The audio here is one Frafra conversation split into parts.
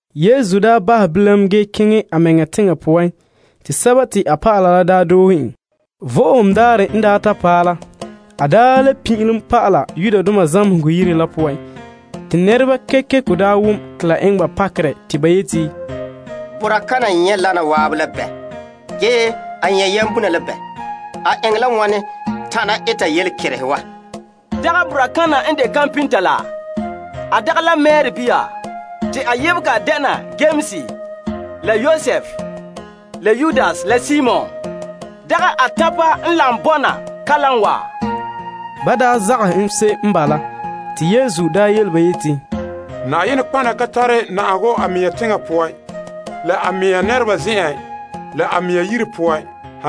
Yesu daa bahɛ bilam ge keŋɛ a mɛŋa teŋa poan te a dɔlɔba la doohe en. Vo'ohogo Daarɛ n ta paɛ la, a pin'ilom pa'ala zamehegɔ yire poan te nɛreba kekeko daa wom te la eŋɛ ba pakerɛ. Te ba yeti, Boraa kana nyɛ' wana wa zan'an la bɛ? Ge a nyɛ' yambomo la bɛ? A eŋɛ la wane tana eta yelekerehe wa? Dagɛ boraa kana n de mɛta la? A dagɛ la Mari bia? Te a yebehe dɛna Yames la Yosef la Yudas la Simon. Dagɛ a tanpa n lagom bɔna kalam wa? Ba zagahɛ se'em n bala. Yesu yele ba yeti, Nɔtɔgɔha ka tare na'ahegɔ a mɛŋa teŋa poan, la a mea nɛreba zen'en, la a mea yire poan.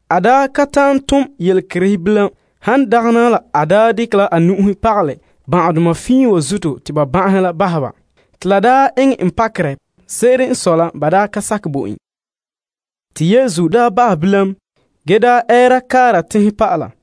A ka ta'an tom yelekerehe bilam, han dagɛna a daa dekɛ la a nu'uhe pagalɛ ban'ahedoma fiin wa zuto te ba ban'ahe la daa bahɛ ba. La daa eŋɛ en pakerɛ, ba daa ka sakɛ bo en la zuo. Te Yesu bahɛ bilam, ge ɛɛra kaara teŋse'ehe poan pa'ala.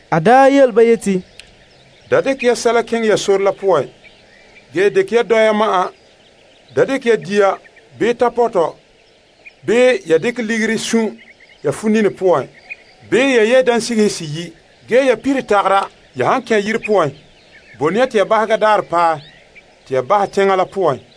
A yele ba yeti, Da dekɛ ya sɛsɛla keŋɛ ya sore la poan, han dagɛna dɔya ma'an. Da dekɛ ya dia, bii tapɔtɔ, bii ya dekɛ ligiri sun' ya funini poan, bii ya yɛ' dansigihe seyi'. Ge ya pire tagara. Ya han kɛn' yire poan, bone ya te ya bahega daarɛ paɛ te ya bahɛ teŋa la poan.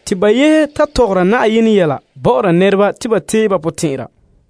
Ba yehe ta mɔɔla bɔ'ɔra nɛreba te ba teehom ba potɛn'ɛra.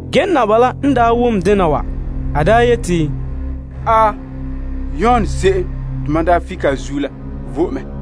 Ge, Herod la n wom dena wa, a yeti, Yon se'em te mam daa fike a zuo la vo'e mɛ.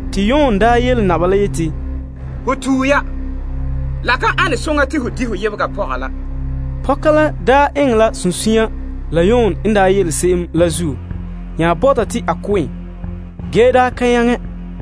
Te Yon daa yele naba la yeti, Ho tue ya. La ka ane soŋa te ho di' ho yebega pɔga la. Herodias la daa eŋɛ la sunsunya la Yon n yele se'em la zuo nya bɔta te a ko' en, ge daa ka nyaŋɛ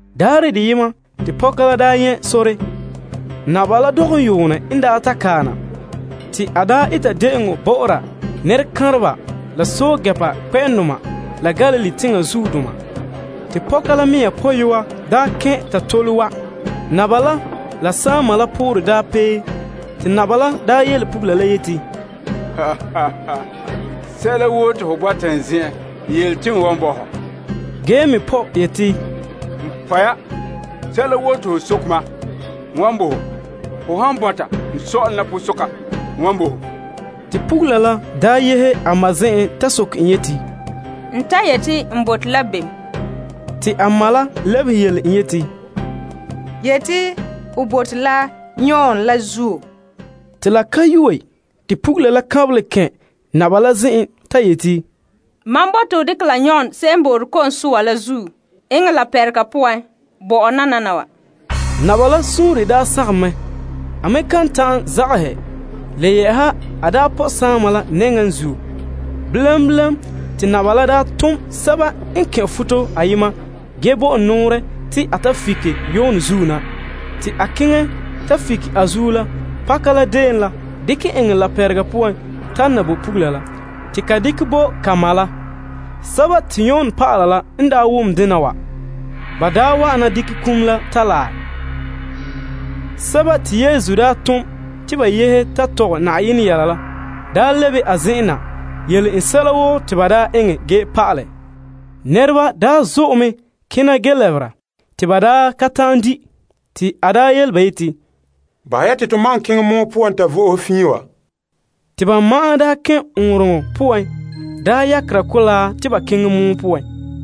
Daarɛ deyema te pɔka la daa nyɛ' sore. Herod la dɔgɔm yuune n ta kae na te a eta de'eŋɔ bɔ'ɔra a nɛrekanreba la pɛɛntɛɛnreba kpɛ'ɛndoma la Galilee teŋa zuodoma. Te Herodias pɔyɔa kɛn' ta tole wa'. Herod la saama la poorɛ daa pee, te naba la daa yele pugula la yeti, Sɛla woo te ho bɔta n zen'en, yele te n wan bo ho. Ge te a me pɔ' yeti, Sɛla woo te ho soke mam, n wan bo ho, ho han bɔta n sɔ'ɔlom la posoka, n wan bo ho. Te pugula la doohe a ma zen'en ta soke en yeti, N ta yeti n bote la bem? Te a ma la lebehe en yeti, Yeti, ho bote la Yon Ko'sɔɔra la zuo. Te pugula la kanbelɛ kɛn' naba la zen'en ta yeti, Mam bote te ho dekɛ la Yon Ko'sɔɔra la zuo eŋɛ laapɛrega poan bo mam nananawa. Naba la suunre daa sagom mɛ. A me kan ta'an zagahɛ. Le yɛ'ɛha n daa pɔ' saama la nɛŋa la zuo. Bilam bilam, te naba la bo nɛra ayema nɔɔrɛ te a fike Yon zuo na. Te a keŋɛ ta fike a zuo la pakadeen la, dekɛ eŋɛ laapɛrega poan tana bo pugula la, te ka dekɛ bo a ma la. Yon dɔlɔba la n daa ta wom dena wa, ba wa'ana dekɛ iŋa la ta laɛ. Sɛba te Yesu daa tom te ba yehe ta mɔɔlɛ la daa lebe la a zen'en na yele en sɛla woo te ba daa eŋɛ ge pa'alɛ la. Nɛreba zo'e mɛ kena na ge lɛbera te ba ka ta'an di', te a yele ba yeti, Bahɛ ya te to ma'an keŋɛ pɔgɔtia poan ta vo'ohe fiin wa. Te ba ma'an kɛn' ɔɔnrɔŋɔ poan yakera mɔgɔrɛ te ba keŋɛ pɔgɔtia poan.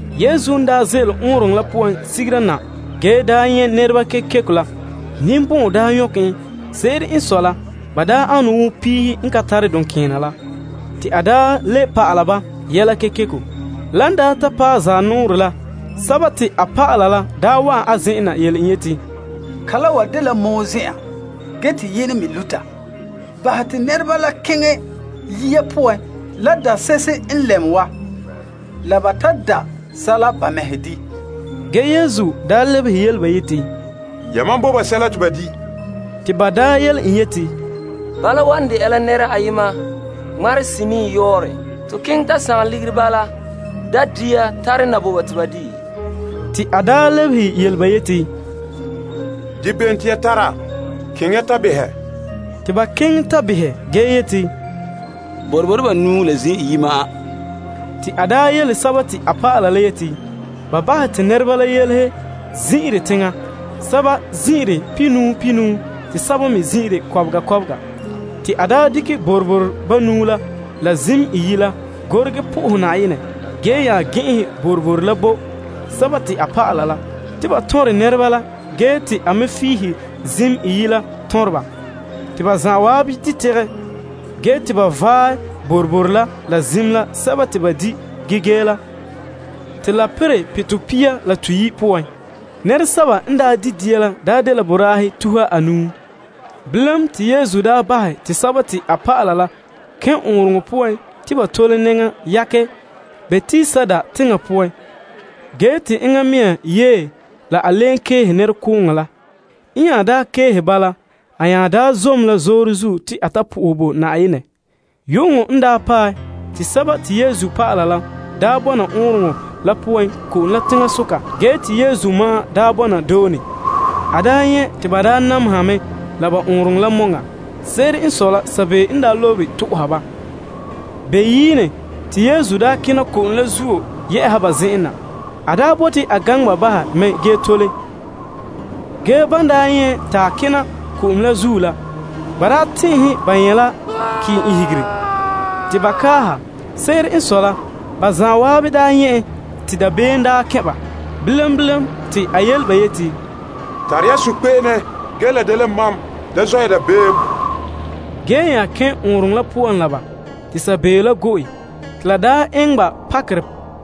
Yesu n ze'ele ɔɔnrɔŋɔ la poan sigera na ge nyɛ' nɛreba kekeko la, ninbɔn'ɔn nyɔkɛ en. Se'ere n sɔe la ba ane wo piihe n ka tare duŋkeena la. Te a le pa'ala ba yɛla kekeko. Lan daa ta paɛ zanɔɔrɛ la, a dɔlɔba la wa'an a zen'en na yele en yeti, Kala wa dela pɔgɔtia zen'an ge te yenɛ me luta. Bahɛ te nɛreba la keŋɛ yiya poan la dase'ehe n lɛm wa, la ba ta da' sɛla ba mɛhe di'. Ge Yesu lebehe ba yeti, Yamam bo ba sɛla te ba di'. Te ba yele en yeti, Bala wan dɛna la nɛra ayema ŋmarehe senii yɔɔrɛ. To keŋɛ ta sagom ligiri bala da' dia tare na bo ba te ba dii? A lebehe ba yeti, Dia bem te ya tara? Keŋɛ ya ta behɛ. Te ba keŋɛ ta behɛ ge yeti, Boroboro banuu la zim iyi'. Te a yele a dɔlɔba la te ba bahɛ te nɛreba la yelehe zin'irɛ teŋa. Te ba zin'ire pihinuu pihinuu, basɛba me kɔbega kɔbega. Te en dekɛ boroboro banuu la la zim iyi' la, a gorege bo Na'ayenɛ fara. Te a nya gɛn'ɛnhɛ boroboro la bo a dɔlɔba la te ba tɔnrɛ nɛreba la. Ge te a me figihe zim iyi' la tɔnrɛ ba. Te ba zan'an di' tegɛ. Ge te dɔlɔba la vaɛ boroboro la zim sɛba te ba di' ge gee la, te ba perɛ pitɔ pia la toyi' poan. Nɛresɛba n di' dia la daa dela boraahe tuha anuu. Bilam, te Yesu daa bahɛ te a dɔlɔba la kɛn' ɔɔnrɔŋɔ poan te ba tole nɛŋa ta yakɛ Betsaida teŋa poan, ge te a keehe nɛrekooŋɔ la. N nya keehe ba la, a nya zom la zoore zuo te a ta sohɛ Na'ayenɛ. Yu'uŋɔ n paɛ, te dɔlɔba la bɔna ɔɔnrɔŋɔ la poan ko'om la teŋasoka ge te Yesu ma'an bɔna doone. A nyɛ' te ba nameha mɛ la ba ɔɔnrɔŋɔ la mɛŋa. Se'ere n sɔe la sabeeo n lobere to'oha ba. Beyiine, te Yesu kena ko'om la zuo yɛ'a ba zen'an na. A bote a gaŋɛ ba bahɛ mɛ ge tole. Ge, ban nyɛ' en ta kena ko'om la zuo la, ba tɛn'ɛhe te ba nyɛ' la kɔkɔ. Te ba kaaha ba zan'an nyɛ' en te dabeem kɛn' ba la zuo. Bilam bilam, te a yele ba yeti, Tare ya sunkpe'ene ge la dela mam. Da zɔ' ya dabeem. Ge te a nya kɛn' ɔɔnrɔŋɔ la poan la ba, te sabeeo la go'e. Te la le eŋɛ ba pakerɛ,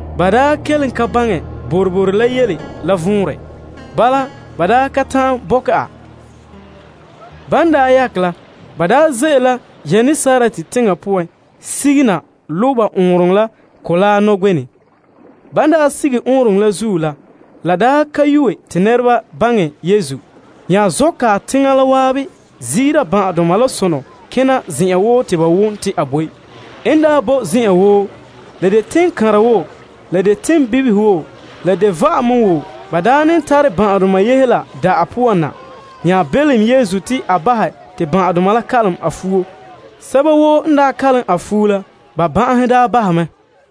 ba daa kelen ka baŋɛ boroboro la yele la vɔnrɛ la zuo. Ba ka ta'an bɔkɛ a. Ban daa yakɛ la, ba ze'ele la Genesaret teŋa poan sige na lo' ba ɔɔnrɔŋɔ la mɔgɔrɛ nɔgbenɛ. Ban sige ɔɔnrɔŋɔ la zuo la, nɛreba baŋɛ Yesu nya zɔ' kae teŋa la waabe ziira ban'ahedoma la sonɔ kena zen'an woo te ba wom te a boe. En boe zen'an woo, la han de teŋkanra woo boo teŋbibihe woo bii va'ame woo, ba ne tare ban'ahedoma yehe la da'ahe poan na. Ba nya belom Yesu te a bahɛ te ban'ahedoma la kalom a fuo ge sɛba woo n kalom a fuo la, ba ban'ahe bahɛ mɛ.